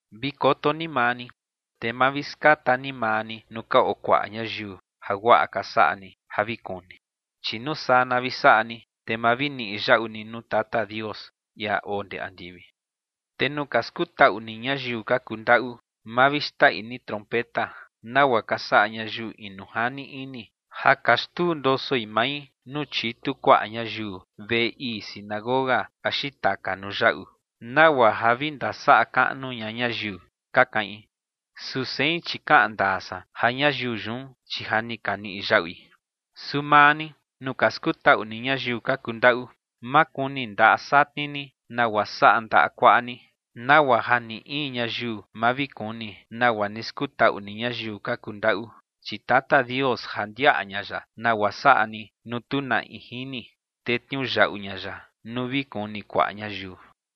’Vi koto ni maa ni, te ma vi skata ni maa ni nuu ka oo kuaꞌa ñayiu jaguaꞌa ka saꞌa ni ja vi kuni, chi nuu saa na vi saꞌa ni, te ma vi niꞌi yaꞌu ni nuu Tata Dios, ia oo ndee andivi. ’Te nuu ka skutaꞌu ni ñayiu ka kuu ndaꞌu, ma vi xtaꞌi ni trompeta, nagua ka saꞌa ñayiu inu jani ini ja ka xtundosoi mai nuu chitu kuaꞌa ñayiu veꞌe ii sinagoga axi taka nuu yaꞌu, nagua ja vi ndasaꞌa kaꞌnu ña ñayiu, ka kaꞌin. Su sein, chi kaꞌan ndaa san ja ñayiu yun, chi ja ni ka niꞌi yaꞌui. Su maa ni, nuu ka skutaꞌu ni ñayiu ka kuu ndaꞌu, ma kuni ndaꞌa satni ni nagua saꞌa ndaꞌa kuaꞌa ni, nagua ja ni in ñayiu ma vi kuni nagua ni skutaꞌu ni ñayiu ka kuu ndaꞌu, chi Tata Dios ja ndiaꞌa ña ya nagua saꞌa ni nuu tu na in jini, te tniuyaꞌu ña ya nuu vi kuni kuaꞌa ñayiu.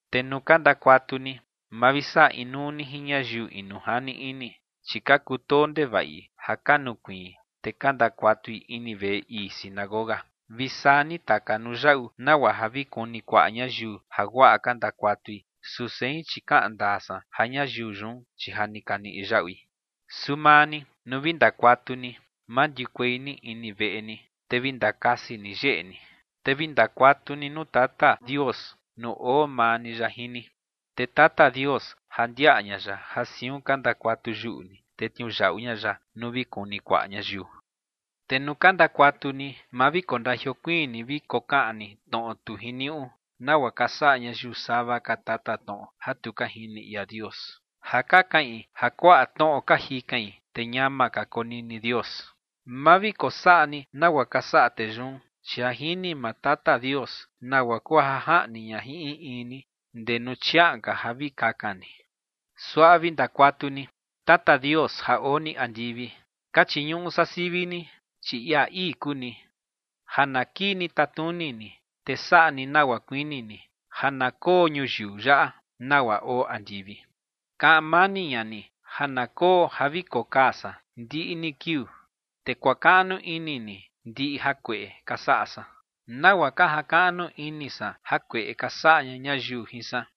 ’Te nuu ka ndakuatu ni, ma vi saꞌa inuu ni jin ñayiu inu jani ini, chi ka kutoo ndevaꞌi ja ka nukuiin, te ka ndakuatui ini veꞌe ii sinagoga vi saa ni taka nuu yaꞌu nagua ja vi kuni kuaꞌa ñayiu jaguaꞌa ka ndakuatui. Su sein, chi kaꞌan ndaa san ja ñayiu yun, chi ja ni ka niꞌi yaꞌui. Su maa ni, nuu vi ndakuatu ni, mandiukuei ni ini veꞌe ni, te vi ndakasi ni yeꞌe ni, te vi ndakuatu ni nuu Tata Dios nuu oo maa ni ya jin ni. Te Tata Dios ja ndiaꞌa ña ya ja siun ka ndakuatu yuꞌu ni, te tniuyaꞌu ña ya nuu vi kuni kuaꞌa ñayiu. ’Te nuu ka ndakuatu ni, ma vi kondajiokuiin ni vi kokaꞌan ni tnoꞌo tu jiniuꞌu, nagua ka saꞌa ñayiu sava ka tatatnoꞌo ja tu ka jini ia Dios, ja ka kaꞌin ja kuaꞌa tnoꞌo ka jikain, te ñama ka konini Dios. Ma vi kosaꞌa ni nagua ka saꞌa tee yun, chi ja jini maa Tata Dios nagua kuu ja jaꞌni ña jin in in ni ndee nuu chiaꞌan ka ja vi kakan ni. Suaꞌa vi ndakuatu ni: Tata Dios ja oo ni andivi, ka chiñuꞌu san sivi ni, chi ia ii kuu ni. Ja na kii ni tatnuni ni, te saꞌa ni nagua kuini ni ja na koo ñuyiu yaꞌa, nagua oo andivi. Kaꞌan mani ña ni ja na koo ja vi kokaa san ndiꞌi ni kiuu. Te kuakaꞌnu ini ni ndiꞌi jakueꞌe ka saꞌa san nagua ka jakaꞌnu ini san jakueꞌe ka saꞌa ña ñayiu jin san.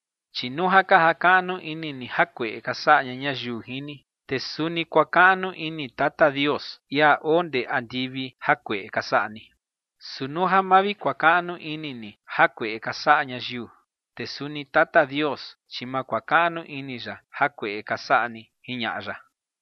’Chi nuu ja ka jakaꞌnu ini ni jakueꞌe ka saꞌa ña ñayiu jin ni, te suni kuakaꞌnu ini Tata Dios, ia oo ndee andivi, jakueꞌe ka saꞌa ni. Su nuu ja ma vi kuakaꞌnu ini ni jakueꞌe ka saꞌa ñayiu, te suni Tata Dios, chi ma kuakaꞌnu ini ya jakueꞌe ka saꞌa ni ͏―͏jiñaꞌa ya.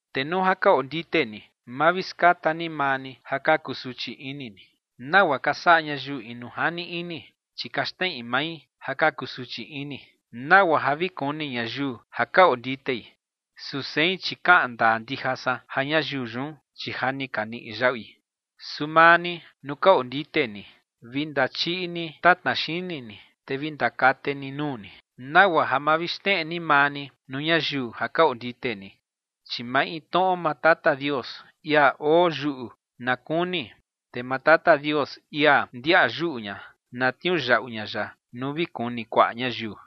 ’Te nuu ka oo ndite ni, ma vi skata ni maa ni ja ka kusuchi ini ni, nagua ka saꞌa ñayiu inu jani ini. Chi ka xneꞌi mai ja ka kusuchi ini, nagua ja vi kuni ñayiu ja ka oo nditei. Su sein, chi kaꞌan ndaa ndija san ja ñayiu yun, chi ja ni ka niꞌi yaꞌui. Su maa ni, nuu ka ondite ni, vi ndachiꞌi ni tatna xini ni, te vi ndakate ni nuu ni, nagua ja ma vi xneꞌe ni maa ni nuu ñayiu ja ka ondite ni. Chi maintnoꞌo maa Tata Dios, ia oo yuꞌu, na kuni. Te maa Tata Dios, ia ndiaꞌa yuꞌu ña, na tniuyaꞌu ña ya nuu vi kuni kuaꞌa ñayiu.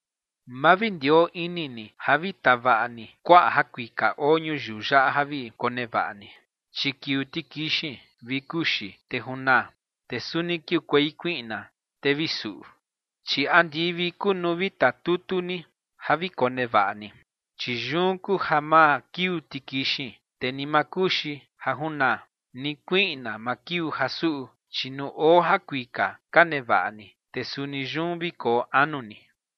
’Ma vi ndioo ini ni ja vi tavaꞌa ni kuaꞌa jakuika oo ñuyiu yaꞌa ja vi konevaꞌa ni, chi kiuu tikixin vi kuxi te junaa, te suni kiukuei kuiꞌna te vi suꞌu. Chi andivi kuu nuu vi tatutu ni ja vi konevaꞌa ni, chi yun kuu ja ma kiuu tikixin, te ni ma kuxi ja junaa, ni kuiꞌna ma kiuu ja suꞌu. Chi nuu oo jakuika ka nevaꞌa ni, te suni yun vi koo anu ni.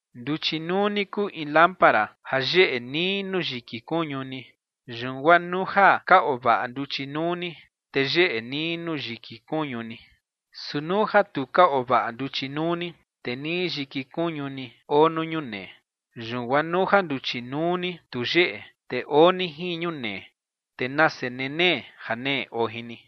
’Nduchi nuu ni kuu in lámpara ja yeꞌe nii nuu yiki kuñu ni. Yun guaa nuu ja ka oo vaꞌa nduchi nuu ni, te yeꞌe nii nuu yiki kuñu ni. Su nuu ja tu ka oo vaꞌa nduchi nuu ni, te nii yiki kuñu ni oo nuu ñunee. Yun guaa nuu ja nduchi nuu ni tu yeꞌe, te oo ni jin ñunee, te ¡nase nenee janee oo jin ni!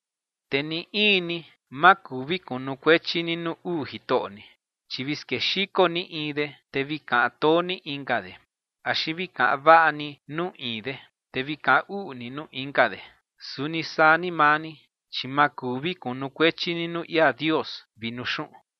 ’Te ni in ni ma kuu vi kunukuechi ni nuu uu jitoꞌo ni, chi vi skexiko ni in de, te vi kaꞌan too ni inka de. Axi vi kaꞌan vaꞌa ni nuu in de, te vi kaꞌan uꞌu ni nuu inka de. Suni saa ni maa ni, chi ma kuu vi kunukuechi ni nuu ia Dios vi nuu xuꞌun.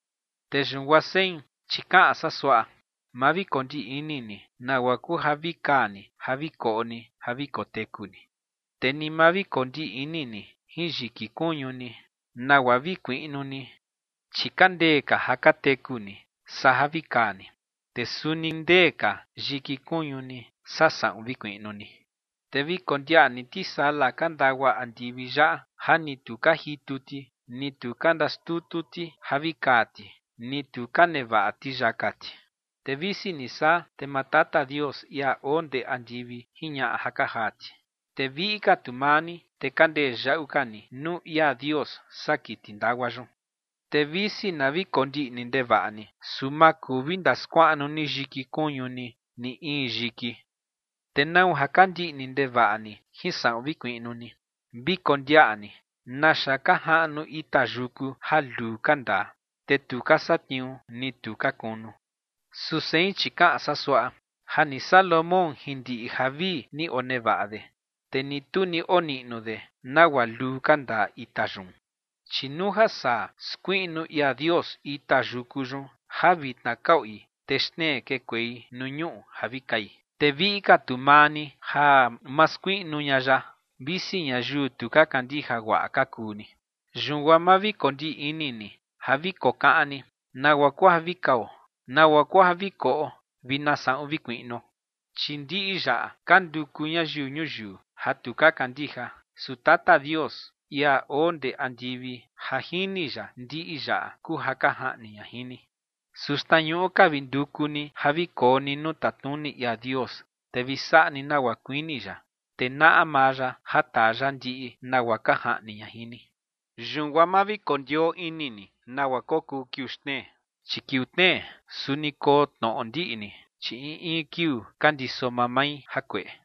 ’Te yun guaa sein, chi kaꞌan san suaꞌa: Ma vi kondiꞌni ni nagua kuu ja vi kaa ni ja vi koꞌo ni ja vi koteku ni. Te ni ma vi kondiꞌni ni jin yiki kuñu ni, nagua vi kuiꞌnu ni. Chi ka ndee ka ja ka teku ni saa ja vi kaa ni. Te suni ndee ka yiki kuñu ni saa saꞌun vi kuiꞌnu ni. Te vi kondiaꞌa ni tisala ka ndagua andivi yaꞌa ja ni tu ka jitu ti, ni tu ka ndaxtutu ti ja vi kaa ti, ni tu ka nevaꞌa ti yaka ti. Te visi ni saa, te maa Tata Dios, ia oo ndee andivi, jiñaꞌa ja ka jaa ti. Te viꞌi ka tu maa ni, te ka ndee yaꞌu ka ni nuu ia Dios saa kiti ndagua yun. Te visi na vi kondiꞌni ndevaꞌa ni, su ma kuu vi ndaskuaꞌnu ni yiki kuñu ni ni in yiki. ’Te ¿nau ja ka ndiꞌni ndevaꞌa ni jin saꞌun vi kuiꞌnu ni? Vi kondiaꞌa ni naxa ka jaꞌnu ita yuku ja luu ka ndaa, te tu ka satniuu ni tu ka kunu. Su sein, chi kaꞌan san suaꞌa: Ja ni Salomón jin ndiꞌi javii ni onevaꞌa de, te ni tu ni oniꞌnu de nagua luu ka ndaa ita yun. Chi nuu ja saa skuiꞌnu ia Dios ita yuku yun ja vitna ka oi te xtnee kekuei nuu ñuꞌu ja vi kai, te viꞌi ka tu maa ni ja ma skuiꞌnu ña ya, visi ñayiu tu ka kandija guaꞌa ka kuu ni. Yun guaa ma vi kondiꞌni ni ja vi kokaꞌan ni: “¿Nagua kuu ja vi kao? ¿Nagua kuu ja vi koꞌo vi na saꞌun vi kuiꞌnuo?” Chi ndiꞌi yaꞌa ka nduku ñayiu ñuyiu ja tu ka kandija. Su Tata Dios, ia oo ndee andivi, ja jini ya ndiꞌi yaꞌa kuu ja ka jaꞌni ña jin ni. Su xtnañuꞌu ka vi nduku ni ja vi koo ni nuu tatnuni ia Dios, te vi saꞌa ni nagua kuini ya, te naꞌa maa ya ja taa ya ndiꞌi nagua ka jaꞌni ña jin ni. Yun guaa ma vi kondioo ini ni nagua kokuu kiuu xtnee, chi kiuu tnee suni koo tnoꞌo ndiꞌni, chi in in kiuu ka ndiso mamai jakueꞌe.